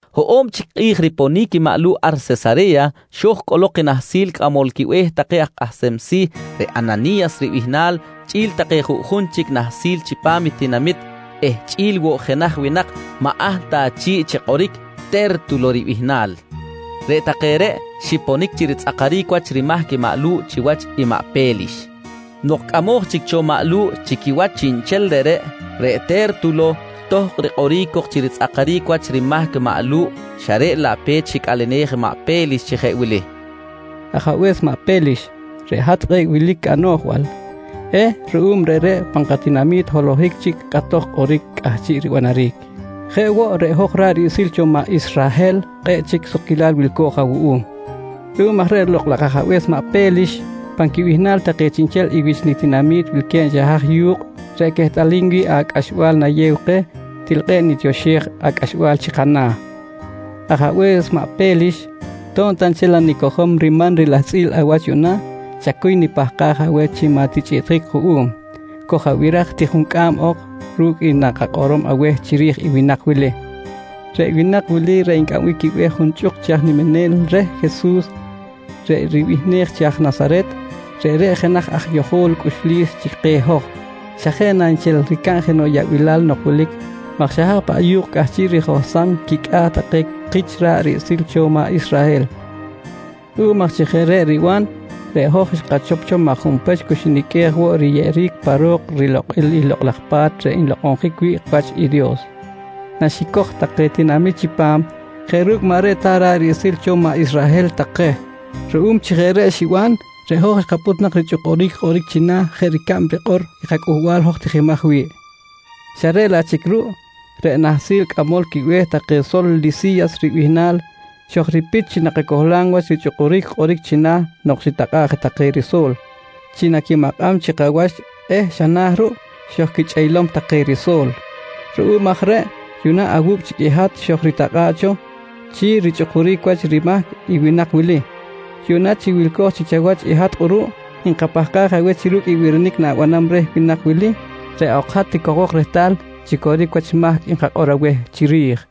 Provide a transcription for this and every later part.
Hoꞌo̱b chic kꞌi̱j riponic maꞌ Lu̱ꞌ ar Sesare̱ya, xo̱j cꞌolok i nahsil cꞌamol quibe̱h take aj kꞌahsem si̱ reꞌ Anani̱yas ribihnal chꞌi̱l take juꞌjun chic nahsil chipam tinamit eh chꞌi̱l woꞌ jenaj winak maꞌ ahl ta chi̱ꞌ chi kꞌoric Te̱rtulo ribihnal. Reꞌ take reꞌ xiponic chi ritzꞌakaric wach rimahc maꞌ Lu̱ꞌ chiwach maꞌ Pe̱lix. Nok cꞌamoj chic cho maꞌ Lu̱ꞌ chi quiwach chiꞌnchel reꞌreꞌ, reꞌ Te̱rtulo tohkꞌ rikꞌoric cok chi ritzꞌakaric wach rimahc maꞌ Lu̱ꞌ xa reꞌ laꞌ pe̱t xicꞌalenej maꞌ Pe̱lix chi jeꞌ wili: «Ajabe̱s maꞌ Pe̱lix, reꞌ hat kꞌe̱ꞌ wilic anoꞌjbal eh ruꞌum reꞌreꞌ pan katinami̱t holohic chic kꞌatoj kꞌoric cꞌahchiꞌ ribanaric. Jeꞌ woꞌ, reꞌ hoj ra̱ꞌ riꞌsil cho maꞌ Israhel kꞌe̱ꞌ chic sukquilal wilco̱j awuꞌum. Ruꞌum aj reꞌ lokꞌ laj ajabe̱s maꞌ Pe̱lix, pan quibihnal take chiꞌnchel i wich nitinami̱t wilque̱b xa haj yu̱kꞌ reꞌ quehtꞌalim wi̱ꞌ acꞌaxbal nayew keh, til kꞌe̱ꞌ nitioxej acꞌaxbal chi kana̱. «Ajabe̱s maꞌ Pe̱lix, to̱b ta nchel nanicojom riman rilahtzꞌil awach yuꞌna, chacuy nipahkaj aweh chi maꞌ tichꞌiꞌtjic kuꞌum. Koj-abiraj ti juncꞌam ok ru̱cꞌ i nakakꞌorom aweh chiri̱j i winak wili. Reꞌ winak wili reꞌ ncꞌambic quibe̱h junchꞌuk chi aj niminel reh Jesus reꞌ ribihnej chi aj Nasaret, reꞌreꞌ jenaj aj yojol cꞌuxlis chi keh hoj, xa jeꞌ na nchel ricab jenoꞌ yaꞌbilal nok wilic maj xa haj paꞌ yu̱kꞌ cꞌahchiꞌ rijohsam quicꞌa̱ take kich ra̱ꞌ riꞌsil cho maꞌ Israhel. Ruꞌum aj chi jeꞌ reꞌ riban, reꞌ hoj xkachop cho maj junpech cu xiniqꞌuej woꞌ riyeꞌeric pa ro̱k rilokꞌil i Lokꞌ laj Pa̱t reꞌ nlokꞌonjic wi̱ꞌ wach i Dios naxicoj take tinamit chipam jeꞌ ru̱cꞌ maꞌ reꞌ ta ra̱ꞌ riꞌsil cho maꞌ Israhel take. Ruꞌum chi jeꞌ reꞌ xiban, reꞌ hoj xkapꞌut nak richꞌukuric kꞌoric china̱ jeꞌ ricab rikꞌor i kacꞌuhbal hoj tijimaj wi̱ꞌ xa reꞌ laꞌ chic ruꞌ reꞌ nahsil cꞌamol quibe̱h take sol Lisi̱yas ribihnal xojripit chi nakacohlam wach richꞌukuric kꞌoric china̱ nok xitakꞌa̱ꞌ take riso̱l chi naquimakꞌam chikawach eh xa na̱ ruꞌ, xojquichꞌeylom take riso̱l. Ruꞌum aj reꞌ yuꞌna awu̱cꞌ chic i hat xojritakꞌa̱ꞌ cho chi richꞌukuric wach rimahc i winak wili. Yuꞌna chi wilco̱j chic chawach i hat kꞌuruꞌ, nkapahkaj aweh chi ru̱cꞌ i birinic na̱banam reh winak wili, reꞌ ok hat ticojbok rehtal chi coric wach mahc nkakꞌor aweh chiri̱j, nqui reh.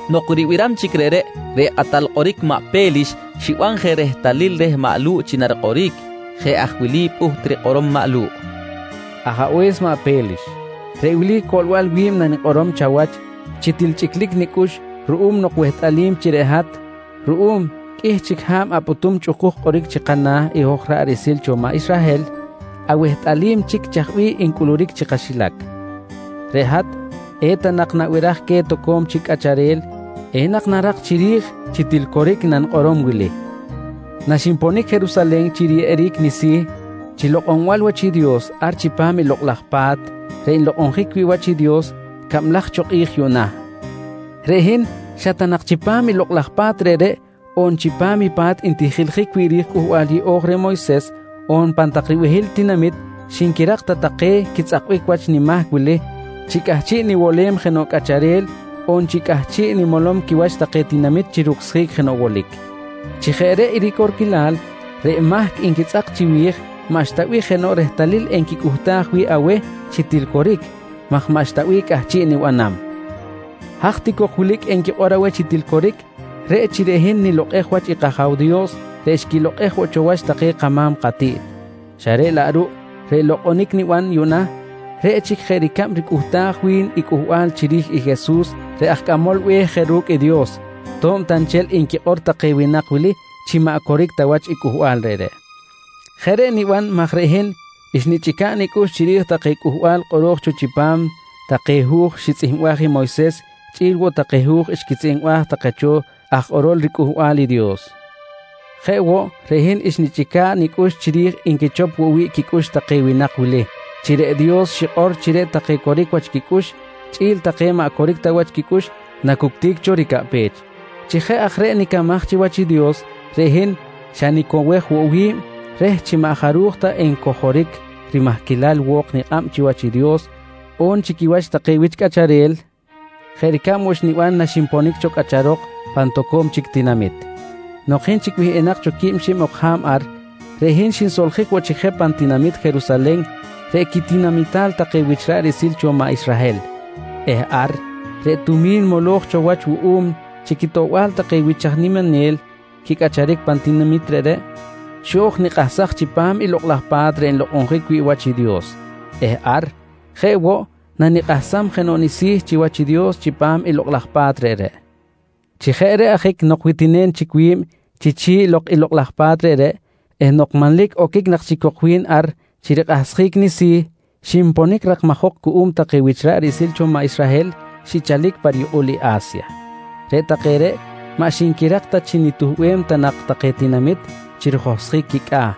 Nok ribiram chic reꞌreꞌ, reꞌ kꞌatal kꞌoric maꞌ Pe̱lix xiban je rehtalil reh maꞌ Lu̱ꞌ chi narikꞌoric. Jeꞌ aj wili pꞌuht rikꞌorom maꞌ Lu̱ꞌ: «Ajabe̱s maꞌ Pe̱lix, reꞌ wili coꞌlbal wi̱b nanikꞌorom chawach chi til chꞌiclic nicꞌux ruꞌum nok wehtꞌalim chi reꞌ hat, ruꞌum qꞌuih chic ha̱b apꞌutum chꞌukuj kꞌoric chi kana̱ i hoj ra̱ꞌ riꞌsil cho maꞌ Israhel, awehtꞌalim chic chaj bih ncꞌuluric chi kaxilac. Reꞌ hat eta nak nabiraj queh toco̱m chic cꞌacharel, enak narak chiri̱j chi til coric i nanikꞌorom wili: Naxinponic Jerusalen chi riyeꞌeric nisi̱ chi lokꞌonbal wach i Dios ar chipam i Lokꞌ laj Pa̱t reꞌ nlokꞌonjic wi̱ꞌ wach i Dios cablaj cho kꞌi̱j yuꞌna, reꞌ hin xa ta nak chipam lokꞌ laj pa̱t reꞌreꞌ on chipam i pa̱t ntijiljic wi̱ꞌ ri̱j i Cꞌuhbal Yeꞌo̱j reh Moyses, on pan tak ribehil tinamit xinquirak ta take quitzꞌakbic wach nimahc wili chi cꞌahchiꞌ niwolem jenoꞌ cꞌacharel, on chi cꞌahchiꞌ nimolom quiwach take tinamit chi rucsjic jenoꞌ wolic. «Chi jeꞌ reꞌ i ricorquilal, reꞌ mahc nquitzꞌak chiwi̱j maꞌxta bih jenoꞌ rehtalil enquicꞌuhtaj wi̱ꞌ aweh chi til coric, maj maꞌxta bih cꞌahchiꞌ nibanam. Haj ti cok wilic enquikꞌor aweh chi til coric, reꞌ chi reꞌ hin nilokꞌej wach i kAja̱w Dios reꞌ xquilokꞌej woꞌ cho wach take kama̱m katiꞌt, xa reꞌ laꞌ ruꞌ reꞌ lokꞌonic niban yuꞌna reꞌ chic jeꞌ ricab ricꞌuhtaj wi̱n i cꞌuhbal chiri̱j i Jesus reꞌ aj Cꞌamol Be̱h je ru̱cꞌ i Dios, to̱b ta nchel nquikꞌor take winak wili chi maꞌ coric ta wach i cꞌuhbal reꞌreꞌ. Jeꞌ reꞌ niban maj reꞌ hin xnichꞌica̱ꞌ nicꞌux chiri̱j take Cꞌuhbal kꞌoro̱j cho chipam take hu̱j xitzꞌihmbaj i Moyses chꞌi̱l woꞌ take hu̱j xquitzꞌihmbaj take cho aj kꞌorol riCꞌuhbal i Dios. Jeꞌ woꞌ, reꞌ hin xnichꞌica̱ꞌ nicꞌux chiri̱j nquichop woꞌ wi̱ꞌ quicꞌux take winak wili chi reꞌ Dios xikꞌor chi reꞌ take coric wach quicꞌux chꞌi̱l take maꞌ coric ta wach quicꞌux nacuctic cho ricaꞌpech. «Chi jeꞌ aj reꞌ nicamaj chiwach i Dios, reꞌ hin xa nicowej woꞌ wi̱b reh chi maꞌ jaruj ta encojoric rimahquilal wo̱k nikꞌab chiwach i Dios, on chi quiwach take wich cꞌacharel, jeꞌ ricab woꞌ xniban naxinponic cho cꞌacharok pan toco̱m chic tinamit. Nok hin chic wihꞌinak cho quib xib ok ha̱b ar, reꞌ hin xinsoljic woꞌ chic je pan tinamit Jerusalen reꞌ quitinamital take wich ra̱ꞌ riꞌsil cho maꞌ Israhel eh ar reꞌ tumi̱n moloj cho wach wuꞌum chi quitoꞌbal take wich aj niminel quicꞌacharic pan tinamit reꞌreꞌ, xo̱j nikꞌahsaj chipam i Lokꞌ laj Pa̱t reꞌ nlokꞌonjic wi̱ꞌ wach i Dios eh ar, jeꞌ woꞌ nanikꞌahsam jenoꞌ nisi̱ chiwach i Dios chipam i lokꞌ laj pa̱t reꞌreꞌ. «Chi jeꞌ reꞌ ajic nok witinem chic wi̱b chi chi̱ꞌ i lokꞌ laj pa̱t reꞌreꞌ eh nok manlic oquic nak chic cok wi̱n ar chi rikꞌahsjic nisi̱, xinponic rakmajok cuꞌum take wich ra̱ꞌ riꞌsil cho maꞌ Israhel xichalic pa riyukꞌul i A̱sya. Reꞌ take reꞌ maꞌ xinquirak ta chi nituhbem ta nak take tinamit chi rijohsjic quicꞌa̱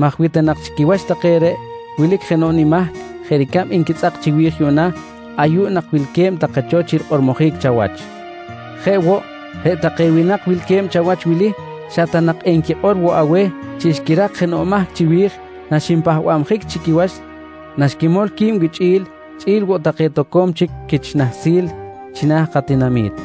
maj wi ta nak chi quiwach take reꞌ wilic jenoꞌ nimahc jeꞌ ricab nquitzꞌak chiwi̱j yuꞌna, ayuꞌ nak wilque̱b take cho chi rikꞌormojic chawach. Jeꞌ woꞌ, reꞌ take winak wilque̱b chawach wili xa ta nak enquikꞌor woꞌ aweh chi xquirak jenoꞌ mahc chiwi̱j naxinpahbabjic chi quiwach naxquimol qui̱b wichꞌi̱l chꞌi̱l woꞌ take toco̱m chic quich nahsil china̱ katinami̱t.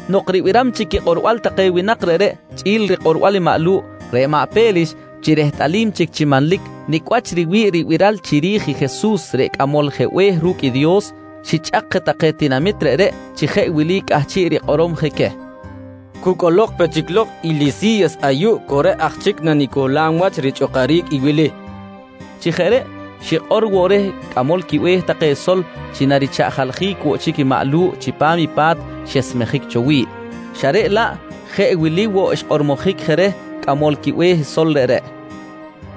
Nok ribiram chic quikꞌorbal take winak reꞌreꞌ chꞌi̱l rikꞌorbal i maꞌ Lu̱ꞌ, reꞌ maꞌ Pe̱lix chi rehtꞌalim chic chi manlic nicꞌ wach riwi̱ꞌ ribiral chiri̱j i Jesus reꞌ Cꞌamol je Be̱h ru̱cꞌ i Dios, xichꞌak je take tinamit reꞌreꞌ chi jeꞌ wili cꞌahchiꞌ rikꞌorom je queh: «Cu cꞌolok pe chic lok i Lisi̱yas ayuꞌ cu reꞌ aj chic nanicohlam wach richꞌukuric i wili, nqui queh. Chi jeꞌ reꞌ, xikꞌor woꞌ reh cꞌamol quibe̱h take sol chi narichaꞌjaljic woꞌ chic i maꞌ Lu̱ꞌ chipam i pa̱t xesmejic cho wi̱ꞌ, xa reꞌ laꞌ jeꞌ wili woꞌ xkꞌormojic je reh cꞌamol quibe̱h sol reꞌreꞌ: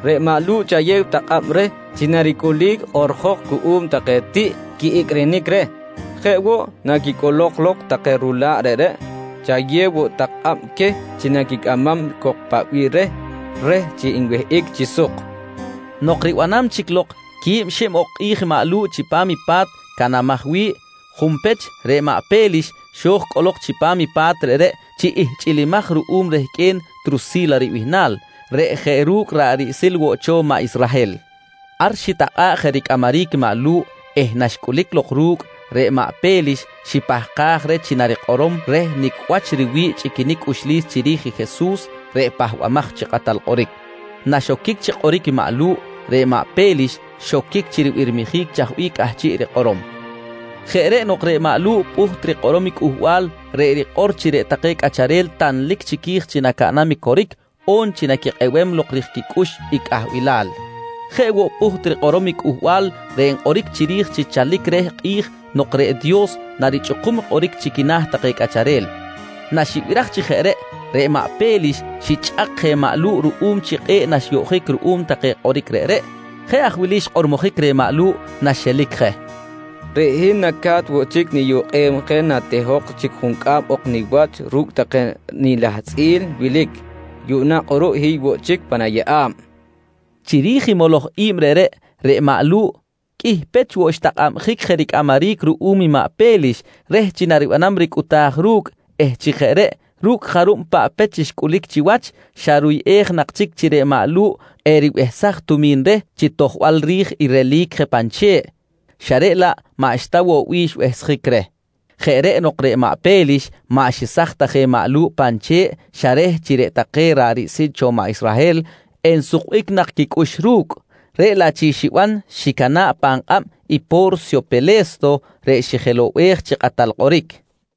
«Reꞌ maꞌ Lu̱ꞌ chayew tak kꞌab reh chi naricꞌulic kꞌoꞌrjok cuꞌum take tiꞌ quiꞌicꞌrinic reh. Jeꞌ woꞌ, naquicꞌolok lok take rula̱ꞌ reꞌreꞌ chayew woꞌ tak kꞌab queh chi naquicꞌamam cok paꞌ bih reh, reh chi enwihꞌic chi suk, nqui xikꞌor. Nok ribanam chic lok quib xib ok kꞌi̱j i maꞌ Lu̱ꞌ chipam i pa̱t canamaj wi̱ꞌ, junpech reꞌ maꞌ Pe̱lix xo̱j cꞌolok chipam i pa̱t reꞌreꞌ chi ihchꞌilimaj ruꞌum rehqꞌue̱n Trusi̱la ribihnal reꞌ jeꞌ ru̱cꞌ ra̱ꞌ riꞌsil woꞌ cho maꞌ Israhel. Ar xitakꞌa̱ꞌ je ricꞌamaric maꞌ Lu̱ꞌ eh naxcꞌulic lok ru̱cꞌ, reꞌ maꞌ Pe̱lix xipahkaj reh chi narikꞌorom reh nicꞌ wach riwi̱ꞌ chꞌiquinic cꞌuxlis chiri̱j i Jesus reꞌ Pahbamaj chi Kꞌatal Kꞌoric. Naxoquic chi kꞌoric i maꞌ Lu̱ꞌ, reꞌ maꞌ Pe̱lix xoquic chi ribirmijic chaj bih cꞌahchiꞌ rikꞌorom. Jeꞌ reꞌ nok reꞌ maꞌ Lu̱ꞌ pꞌuht rikꞌorom i cꞌuhbal reꞌ rikꞌor chi reꞌ take cꞌacharel tanlic chiqui̱j chi nacaꞌnam i coric on chi naquikꞌebem lok rij quicꞌux i cꞌahbilal. Jeꞌ woꞌ, pꞌuht rikꞌorom i cꞌuhbal reꞌ nkꞌoric chiri̱j chi chalic reh kꞌi̱j nok reꞌ Dios narichꞌukum kꞌoric chi quina̱ take cꞌacharel. Naxibiraj chi jeꞌ reꞌ, reꞌ maꞌ Pe̱lix xichꞌak je maꞌ Lu̱ꞌ ruꞌum chi kꞌe̱ꞌ naxyoꞌjic ruꞌum take kꞌoric reꞌreꞌ. Jeꞌ aj wili xkꞌormojic reh i maꞌ Lu̱ꞌ naxelic je: «Reꞌ hin naca̱t woꞌ chic niyukꞌem je natehok chic juncꞌam ok niwach ru̱cꞌ take nilahtzꞌil wilic. Yuꞌna kꞌuruꞌ hiy woꞌ chic pan ayeꞌa̱b, nqui reh. Chiri̱j i moloj i̱b reꞌreꞌ, reꞌ maꞌ Lu̱ꞌ qꞌuih pech woꞌ xtakꞌabjic je ricꞌamaric ruꞌum i maꞌ Pe̱lix reh chi naribanam ricꞌuta̱j ru̱cꞌ eh chi jeꞌ reꞌ ru̱cꞌ jarub paꞌ pech xcꞌulic chiwach, xa ruyꞌej nak chic chi reꞌ maꞌ Lu̱ꞌ eribehsaj tumi̱n reh, chi tojbal ri̱j i relic je pan che̱ꞌ xa reꞌ laꞌ maꞌxta woꞌ bih xbehsjic reh. Jeꞌ reꞌ nok reꞌ maꞌ Pe̱lix maꞌ xesaj ta je maꞌ Lu̱ꞌ pan che̱ꞌ, xa reh chi reꞌ take ra̱ꞌ riꞌsil cho maꞌ Israhel ensukbic nak quicꞌux ru̱cꞌ. Reꞌ laꞌ chic xiban, xicana̱ꞌ pan kꞌab i Po̱rsyo Pele̱sto reꞌ xijelow-bej chi kꞌatal kꞌoric.